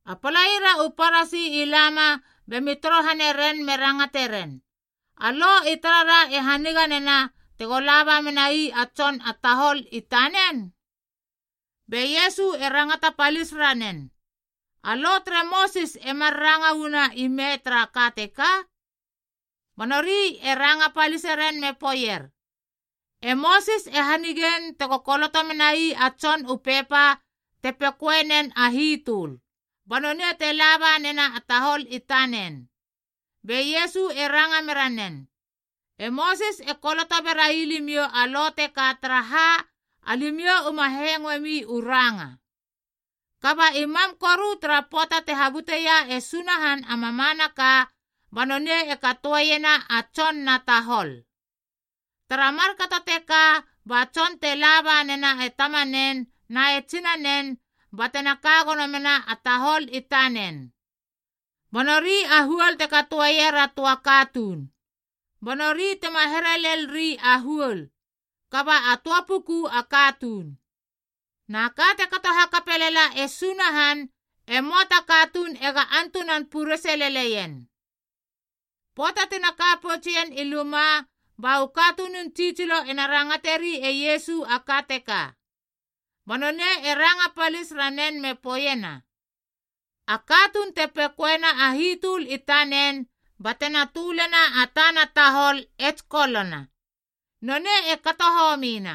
A palaira u Parasi i lama bemi torohane ren me rangate ren, “A Lo i tarara e haniga nena tego laba menai a tson a tahol i tanen?” Be Iesu e rangata palis ranen, “E Mosis emar ranga uu ime tara ka teka?” Ba nori e ranga paliseren me poeier, “E Mosis e hanigein tego koloto menai a tson u pepa te pekoenen a hitöl, ba nonei te laba nena a tahol i tanen.” Be Iesu e ranga mera nen, “E Mosis e koloto berai limiou a Lo teka taraha, alimiou uma hengoemi u ranga. Kaba i mam koru tara pöata te habuteia e Sunahan a mamanaka, ba nonei e katoeiena a tson na tahol. ‘Tara markato teka ba tson te laba nena e tamanen na e tsinanen ba tena ka gono mena a tahol i tanen.a Ba nori a huol te katoeier a töa katuun.’ Ba nori tema here lel ri a huol, kaba a töa puku a katuun. Na ka te kato hakapelala e Sunahan e möa ta katuun ega antunan purese leleien.” Pöata tina ka poutsien i luma, ba u katunun tsitsilo ena rangateri e Iesu a ka teka. Ba nonei e ranga palis ranen me poeiena, “A katuun te pekoena a hitöl i tanen ba tena tölena a tana tahol e tsikolona, nonei e kato homina.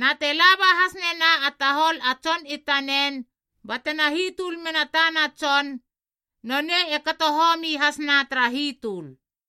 Na te laba has nena a tahol a tson i tanen ba tena hitöl mena tana tson, nonei e kato homi hasna tara hitöl.”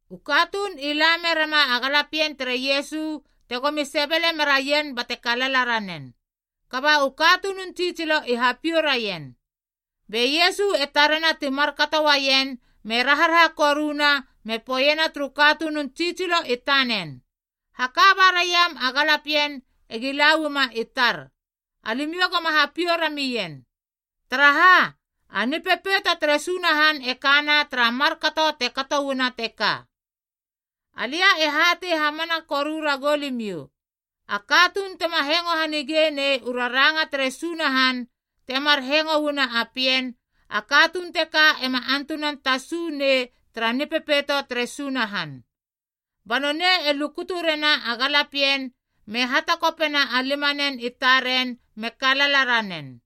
U katuun i la merema a galapien tere Iesu tegomi sebele meraien bate kalala ranen, kaba u katunun tsitsilo i hapiou raien. Be Iesu e tarena ti markato uaien me raharaha koruna me poeiena turu katunun tsitsilo i tanen, “Haka ba raiam a galapien egi la uama i tar, alimiou goma hapiou ramien. Taraha, a Nipepeito tere Sunahan e kana tara markato te kato uana teka. Alia e hatei hamana koru ragou limiou, a katuun tema hengo hanige nei u raranga tere Sunahan temar hengo uana a pien, a katuun teka ema antunan tasu nei tara Nipepeito tere Sunahan.” Ba nonei e lukutu rena a galapien me hatakopena a limanen i taren me kalala ranen.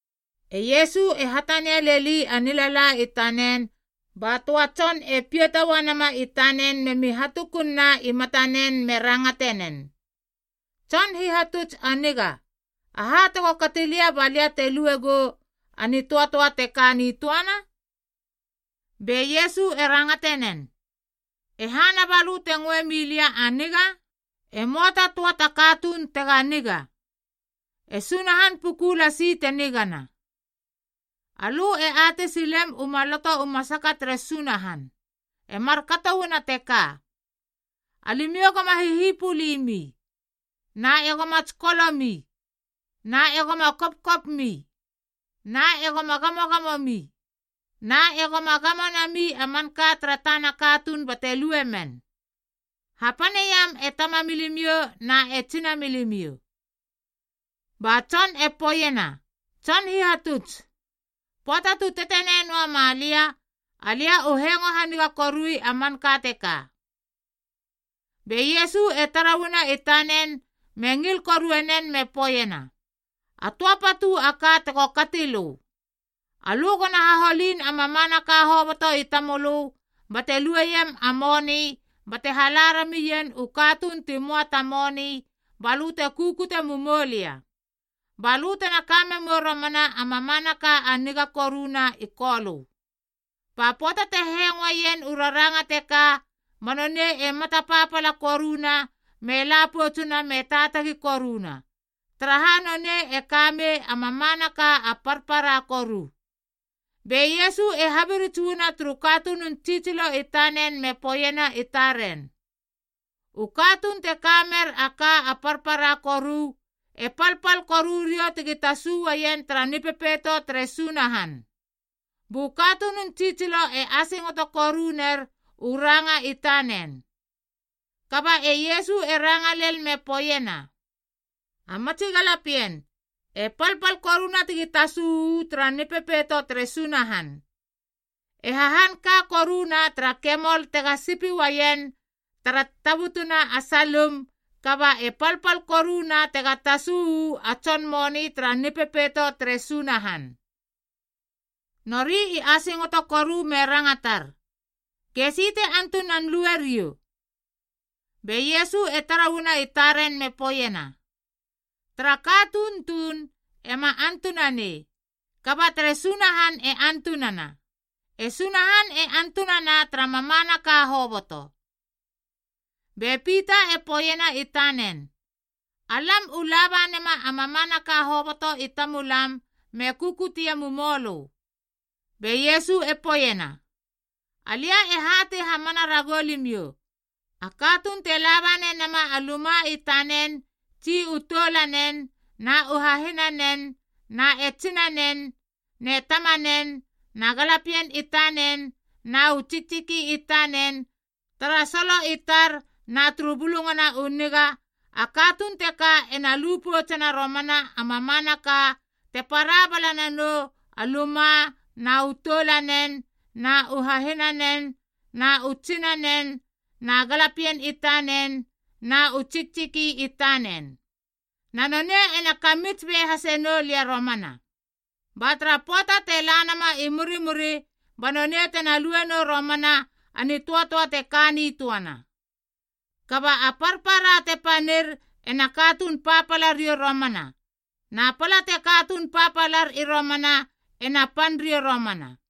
E Iesu e hatania leli a nilala i tanen ba töa tson e piata uanama i tanen memi hatukun na i matanen me rangate nen, “Tson Hihatuts a niga, aha tego kati lia ba lia te luegou a nitöatöa te ka nitöana?” Be Iesu e rangate nen, “E hana balö te ngoe milia a niga? E möa ta töa ta katuun tega niga. E Sunahan puku lasi te nigana. Alö e atei silem u Maloto u Raranga tere Sunahan. E markato uana teka: ‘Alimiou goma hihipulimi. Na egoma tsikolomi. Na egoma kopkopmi. Na egoma gamogamomi. Na egoma gamo nami a manka tara tana katuun bate luemen. Hapaneiam e tamamilimiou na e tsinamilimiou.’” Ba tson e poeiena, “Tson Hihatuts, pöata tu tetenei noama lia, alia u hengo haniga korui a manka teka.” Be Iesu e tara uana i tanen me ngil korue nen me poeiena, “A töa patu a ka tego kati lö. Alö gona haholin a mamanaka hoboto i tamölö bate lueiem a moni bate hala ramien u katuun ti möa ta moni balö te kukute mumoulia. Balö tena ka memou romana a mamanaka a niga koruna i Kolö.” Ba pöata te hengoeien u raranga teka ba nonei e mata papala koruna me la poutsuna me taatagi koruna, taraha nonei e ka mei a mamanaka a parpara koru. Be Iesu e habirits uana turu katunun tsitsilo i tanen me poeiena i taren, “U katuun te ka mer a ka a parpara koru e palpal koru riou tegi tasu uaien tara Nipepeito tere Sunahan.” Bu katunun tsitsilo e asingoto koru ner u ranga i tanen. Kaba e Iesu e ranga lel me poeiena, “A matsi galapien, e palpal koruna tegi tasu uu tara Nipepeito tere Sunahan. E hahan ka koruna tara kemol tega sipi uaien tara tabutuna a salim kaba e palpal koruna tega tasu uu a tson moni tara Nipepeito tere Sunahan.” Nori i asingoto koru me rangatar, “Gesi te antunan lue riou?” Be Iesu e tara uana i taren me poeiena, “Tara katuun tuun ema antunanei, kaba tere Sunahan e antunana. E Sunahan e antunana tara mamanaka hoboto.” Be Pita e poeiena i tanen, “Alam u laba nema a mamanaka hoboto i tamulam me kukutie mumoulö.” Be Iesu e poeiena, “Alia e hatei hamana ragou limiou, a katuun te laba nenama a luma i tanen tsi u toulanen na u hahinanen na e tsinanen ne tamanen na galapien i tanen na u tsiktsiki i tanen tara solo i tar na turu Bulungana u Niga, a katuun teka ena lu poutsena romana a mamanaka te para bala nanou a luma na u toulanen na u hahinanen na u tsinanen na galapien i tanen na u tsiktsiki i tanen. Na nonei ena kamits be hase nou lia romana. Ba tara pöata te la nama i murimuri, ba nonei tena lue nou romana a nitöatöa te ka nitöana. Kaba a parpara te panir ena katuun papala riou romana, na pala te katuun papalar i romana ena pan riou romana.”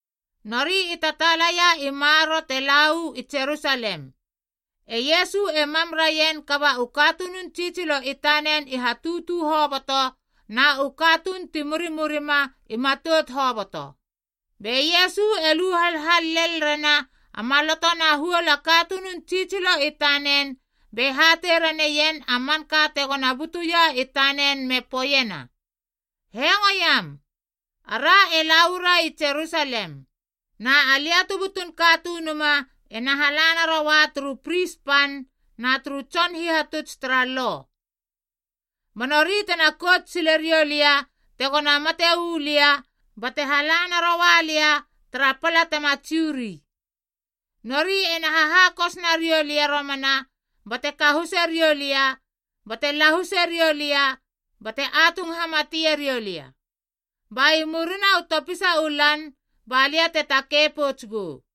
Nori i tataalaia i maroro te la uu i Jerusalem, e Iesu e mam raien kaba u katunun tsitsilo i tanen i hatutu hoboto na u katuun ti murimurima i matout hoboto. Be Iesu e lu halhal lel rena a maloto na huol a katunun tsitsilo i tanen be hatei raneien a manka tegona butuia i tanen me poeiena, “Hengoiam, ara e la uara i Jerusalem, na Alia tu Butun Katunuma ena hala naroua turu pris pan na turu tson hihatuts tara Lo. Ba nori tena kout sile riou lia tegona mate uu lia bate hala naroua lia tara pala tema Jiu ri. Nori ena hahakos nariou lia romana bate kahuse riou lia bate lahuse riou lia bate atung hamatie riou lia. Ba i murina u topisa u lan ba lia te takei pouts gou.”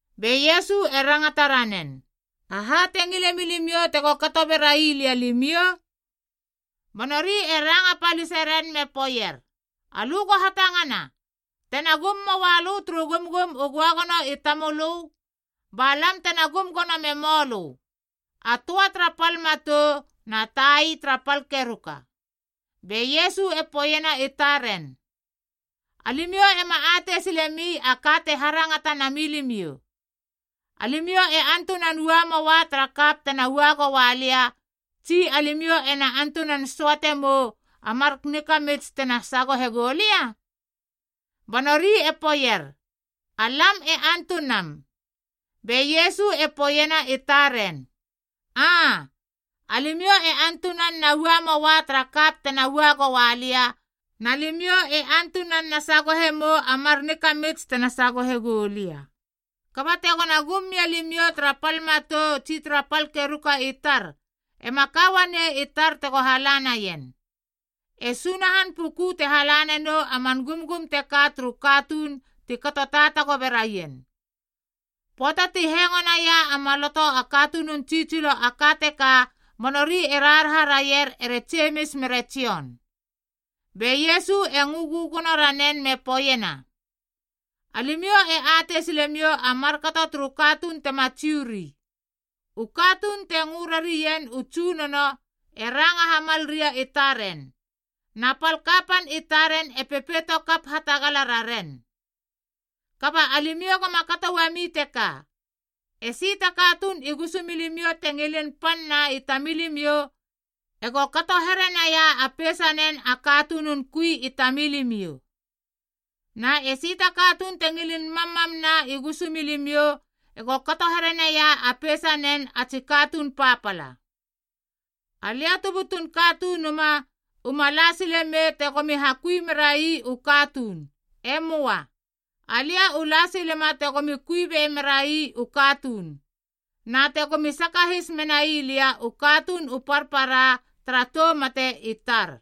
Be Iesu e rangata ranen, “Aha te ngile milimiou tego kato bera ii lia alimiou?” Ba nori e ranga palise ren me poeier, “Alö go hatangana, tena gum moa lö turu Gumgum u Göagono i Tamölö, ba lam tena gum gono memou lö, a töa tara pal matou na tai tara pal keruka.” Be Iesu e poeiena i taren, “Alimiou ema atei silemi a ka te harangata na milimiou. Alimiou ena antunan ua moa tara kap tena ua goua lia tsi alimiou ena antunan söate mou a mar nikamits tena sagohe gou lia?” Ba nori e poeier, “Alam e antunam.” Be Iesu e poeiena i taren, “Aa, alimiou e na ua moa tara kap tena ua goua lia, na limiou e na sagohe mou a mar nikamits tena sagohe goulia. Kaba tegona gum mia limiou tara pal matou tsi tara pal keruka i tar, ema ka uanei i tar tego halanaien. E Sunahan puku te hala nanou a man gumgum teka turu katuun ti kato taatago beraien.” Pöata ti hengo naia a maloto a katunun tsitsilo a ka teka ba nori e raharaha raier ere Jemis mere Jon. Be Iesu e ngö gögono ranen me poeiena, “Alimiou e atei silemiou a markato turu katuun tema Jiu ri. U katuun te ngö rarien u tsunono e ranga hamal ria i taren, na pal kapan i taren e pepeito kap hatagala raren. Kaba alimiou goma kato uami teka. Esi ta katuun i gusumilimiou te ngilin pan na i tamilimiou ego kato herenaia a peisanen a katunun kui i tamilimiou. Na esi ta katuun te ngilin mammam na i gusumilimiou ego kato herenaia a peisanen a tsi katuun papala. Alia tu butun Katunuma uma la sile mei tegomi hakui mera ii u katuun. E moa. Alia u la silema tegomi kui be mera ii u katuun, na tegomi sakahis menai lia u katuun u parpara tara tou mate i tar.”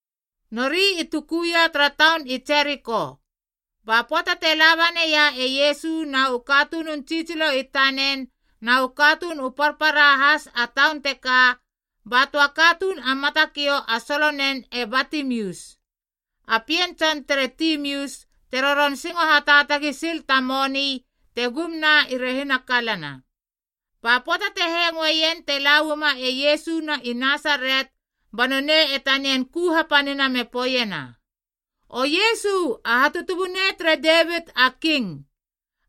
Nori i tukuia tara taun i Jeriko. Ba pöata te laba neia e Iesu na u katunun tsitsilo i tanen na u katuun u parpara has a taun teka, ba töa katuun a matakiou a solonen e Batimius, a pien tson tere Timius te roron singo hataatagi sil ta moni te gum na i rehina kalana. Ba pöata te hengoeien te la uama e Iesu na i Nasaret ba nonei e tanian ku hapanina me poeiena, “O Iesu a Hatutubunei tere Devit a King,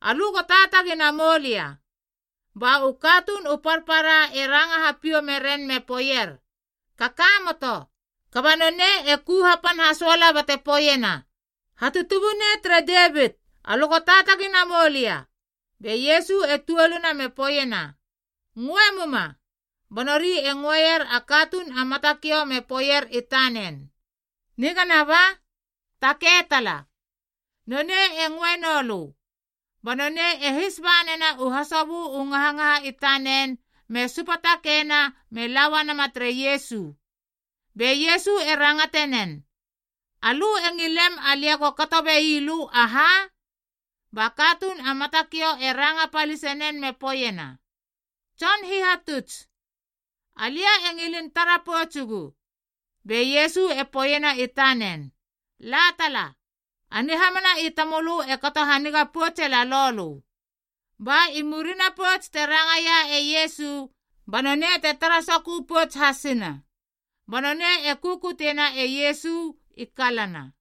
alö go taatagi namoulia.” Ba u katuun u parpara e ranga hapiou meren me poeier, “Kakamoto.” Kaba nonei e ku hapan hasoala bate poeiena, “Hatutubunei tere Devit, alö go taatagi namoulia.” Be Iesu e tuoluna me poeiena, “Ngöe muma.” Ba nori e ngöeier a katuun a matakiou me poeier i tanen, “Nigana ba! Takei tala. Nonei e ngöe noulö.” Ba nonei e his ba nena u hasobö u ngahangaha i tanen me supatakeina me la uanama tere Iesu. Be Iesu e rangate nen, “Alö e ngilem alia go kato be ii lö aha?” Ba katuun a matakiou e ranga palisenen me poeiena, “Tson Hihatuts, alia e ngilin tara poutsugu.” Be Iesu e poeiena i tanen, “La tala. A nihamana i tamölö e kato haniga poutse lalou lö.” Ba i murina pouts te rangaia e Iesu banonei te tara sokö pouts hasina, ba nonei e kukuteiena e Iesu i kalana.